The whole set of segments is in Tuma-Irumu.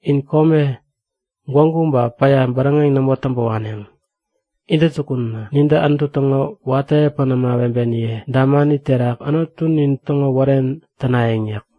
In kome, gwägu ba päya bäräŋeŋ nämo täŋpä waneŋ. Intäjukunä nintä Anutu täŋo watä epän ämawebeniye damani terak Anutunin täŋo wären tänayäŋ yäk.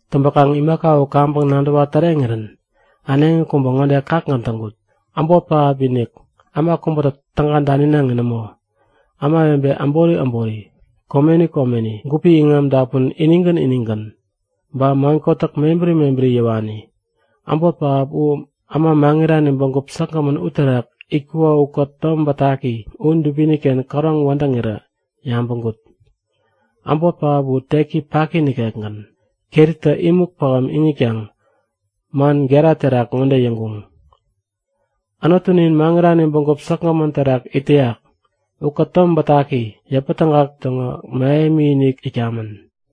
Täŋpäkaŋ imaka u kaŋpäŋ nadäwa täreŋirän äneŋi kubä ŋode kakgän täŋkut; Äbot pähap-inik, äma kubätä täga daninaŋi nämo, ämawebe äbori äbori, komeni komeni, gupi iŋam dapun inigän inigän, ba man kotäk mebäri mebäri yäwani, äbot pähap u äma maŋirani bägup säkgämän uterak itkuko ukät Tom Bätaki u dubini-ken käroŋ wädäŋirä yabäŋkut. Äbot pähap u tek paki nikekgän, keritä imuk pähäm iŋitkaŋ man gera terak ŋode yäŋkuŋ; Anutunin, maŋirani bägup säkgämän terak it täyak ukät Tom Bätaki, yäpätägak täŋo mähemi-inik itkamän.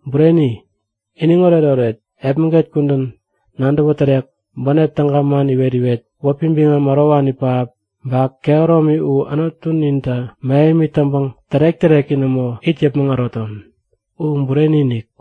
Bureni! Iniŋ oretoret, epmäget kudän, nadäwä tärek, bänep täga man iwet-iwet, wäpi biŋam ärowani pähap, ba kehäromi u Anutunintä mähemi täŋpäŋ tärek-täreki nämo it yäpmäŋ äroton! U bureni-inik!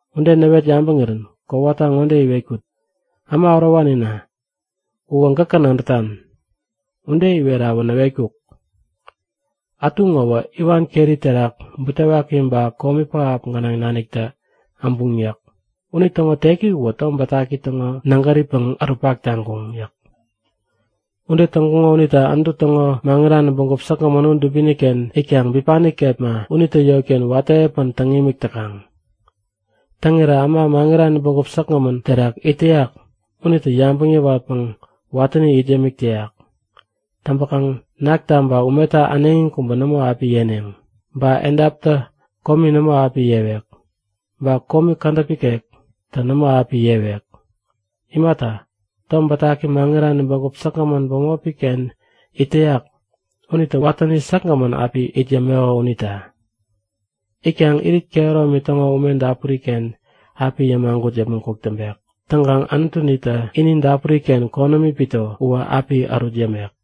Ude näwet yabäŋirän kowata ŋode iwetkut; Äma ärowanina, uwä gäkä nadätan. Ude iwerawä näwetkuk; Ätu ŋowä iwan keri terak butewaki ba komi pähap gänaŋ naniktä äbuŋ yäk. Unitäŋo teki uwä Tom Bätaki täŋo nägäripäŋ ärutpak taŋkuŋ yäk. Ude täŋkuŋo unita Anutu täŋo maŋirani bägup säkgämän u dubini-ken itkaŋ bipani kepma unitä yotken watä epän täŋ imik täkaŋ. Täŋirä äma maŋirani bägup säkgämän terak it täyak unitä yabäŋ yäwatpäŋ watäni it yämik täyak. Täŋpäkaŋ nakta ba umeta äneŋi kubä nämo api yeneŋ. Ba edaptä komi nämo api yewek. Ba komi kädäp ikektä nämo api yewek. Imata, Tom Bätaki maŋirani bägup säkgämän bämopi-ken it täyak unitä watäni säkgämän api it yämeko unita. Itkaŋ irit kehäromi täŋo ume dapuri-ken api yämagut yäpmäŋ kuk täŋpek. Täŋkaŋ Anutunitä ini dapuri-ken konämi pito uwä api ärut yämek.